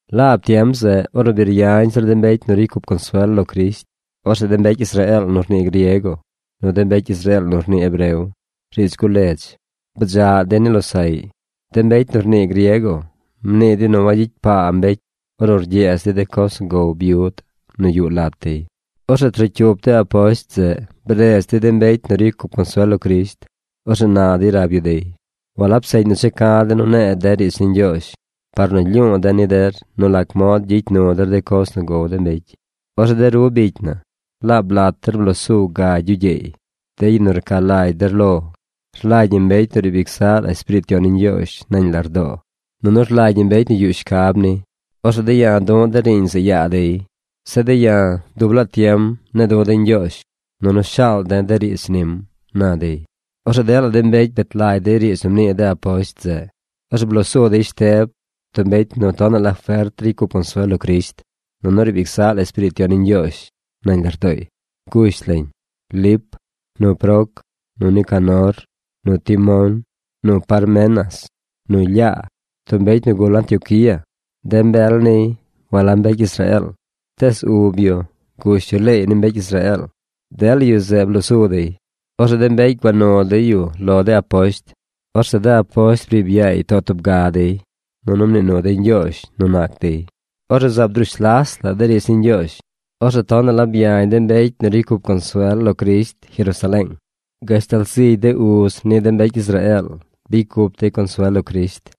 Laab tiem zeꞌ, ornu bi ryañ zir de mbecy nu ricy cup consuel lo Crisht, orzeꞌ de mbecy Israeel nu rnii griego nu de mbecy Israeel nu rnii hebreo, riidz guledz, bdzaꞌ dey ni losaꞌy. De mbecy nu rnii griego mnii dey nu wagyicy paa mbecy ornu rgyeez dey de coz nu gow byud nu yuꞌ lat dey. Orzeꞌ trocyup de aposht zeꞌ bredz dey de mbecy nu ricy cup consuel lo Crisht. Orzeꞌ na dey rab yu dey: ―Walab seꞌñ nu checa̱ de̱ nu ne̱e̱ de riidz ni Ñgyoozh par nu lyu̱u̱ de̱ ni der nu lac mod gyicy nu der de coz nu gow de mbecy. Orzeꞌ de ru bicy na, laab lat der bloo su gagy yu gyeey, de yu nu rca lagy der lo. Rlagy ñi mbecy nu riib ic zaꞌ la Espiriit Yon ni Ñgyoozh nañ lardoo, nunu rlagy ñi mbecy nu yuꞌ shcab ni. Orzeꞌ de̱ ya̱ du̱ꞌ de̱ riiñ zeꞌ yaa dey. Zeꞌ de̱ ya̱, dub laa tiem ne̱e̱ du̱ de̱ Ñgyoozh, nunu shaal de̱ de riidz nim ―na dey. Orzeꞌ dela mbecy bet lagy dey riidz nu mnii de aposht zeꞌ. Orzeꞌ bloo su dey Shteb, tub mbecy nu tonaꞌ la fert ricy cup consuel lo Crisht. Nunu riib ic zaꞌ la Espiriit Yon ni Ñgyoozh nañ lardooy. Gush lañ: Lip, nu Proc, nu Nicanor, nu Timón, nu Parmenas, nu Lyaa, tub mbecy nu gul Antioquía. De uz yu walab mbecy Israeel, tees ub yu gush yu leey ni mbecy Israeel. Dela yu zeꞌ bloo su dey. Orzeꞌ de mbecy gua nu dey yu lo de aposht. Orzeꞌ de aposht briib yaay too tub ga dey, nunu mnii nu dey Ñgyoozh nu nac dey. Orzeꞌ zaab drush las la de riidz ni Ñgyoozh. Orzeꞌ tonaꞌ la byañ de mbecy nu ricy cup consuel lo Crisht Jerusaleeng. Gashtal zigy de uz ni de mbecy Israeel bicy cup dey consuel lo Crisht.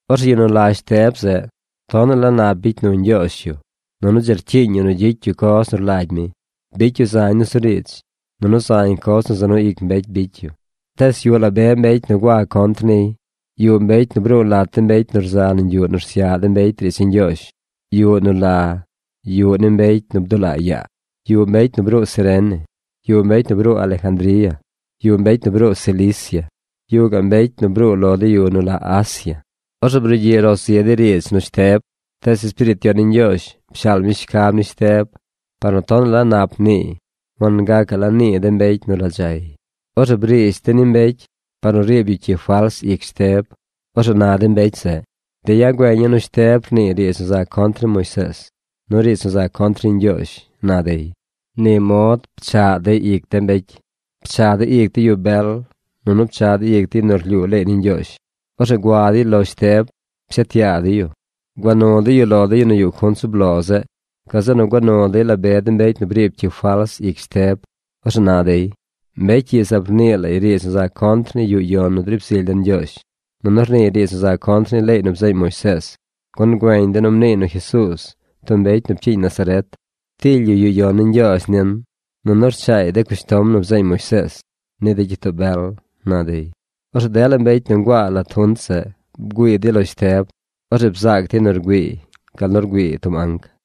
Orzeꞌ yu nu la Shteb zeꞌ, tonaꞌ la nap bicy nu Ñgyoozh yu nunu dzi rcyiiñ yu nu gyicy yu coz nu rlagy mi. Bicy yu zañ nusuriidz, nunu zañ coz nu za nu ic mbecy bicy yu. Tees yuꞌ la be mbecy nu gua contr niy. Yuꞌ mbecy nu bruu lat de mbecy nu rza nañ yuꞌ nu rsyaꞌ de mbecy riidz ni Ñgyoozh, yuꞌ nu la Yuꞌ ni De Mbecy nu Bdulaa Yaa. Yuꞌ mbecy nu bruu Cirene, yuꞌ mbecy nu bruu Alejandría, yuꞌ mbecy Cilicia. Yuꞌ gaꞌ mbecy nu bruu lo de yu nu la Asia. Orzeꞌ brugyiꞌ ro zi dey riidz nu Shteb. Tees Espiriit Yon ni Ñgyoozh pshaal mi shcab ni Shteb. Par nu tonaꞌ la nap mniiy, wangacaꞌ la nii de mbecy nu radzay. Orzeꞌ briish dey ni mbecy par nu riib yu cyi fals ic Shteb. Orzeꞌ na de mbecy zeꞌ: ―De̱ ya̱ güeña̱ nu Shteb rniiy riidz nu za contr ni Moisees, nu riidz nu za contr ni Ñgyoozh ―na dey. Ni mod pchaꞌ dey ic de mbecy. Pchaꞌ dey ic de yu bel, nunu pchaꞌ dey ic de yu nu rlyuu leey ni Ñgyoozh. Orzeꞌ gua dey lo Shteb pshet yaa dey yu. Gua nu dey yu lo de yu nu yuꞌ junt zub lo zeꞌ. Gazeꞌ nu gua nu dey la be de mbecy nu briib cyi fals ic Shteb. Orzeꞌ na dey: ―Mbecy ii zaab rnii lay riidz nu za contr ni yuꞌ yon nu driib zily den Ñgyoozh, nunu rniiy riidz nu za contr ni leey nu bzeeñ Moisees. Gun güeñ de̱ nu mniiy nu Jesuuz, tub mbecy nu pcyiiñ Nazaret, tily yu yuꞌ yon ni Ñgyoozh nin, nunu rchaay de cushtom nu bzeeñ Moisees ni de gyitoo bel ―na dey. Orzeꞌ dela mbecy nu nguaa lat junt zeꞌ bgüii dey lo Shteb. Orzeꞌ bzaac dey nu rgüiiy gal nu rgüii tub anc.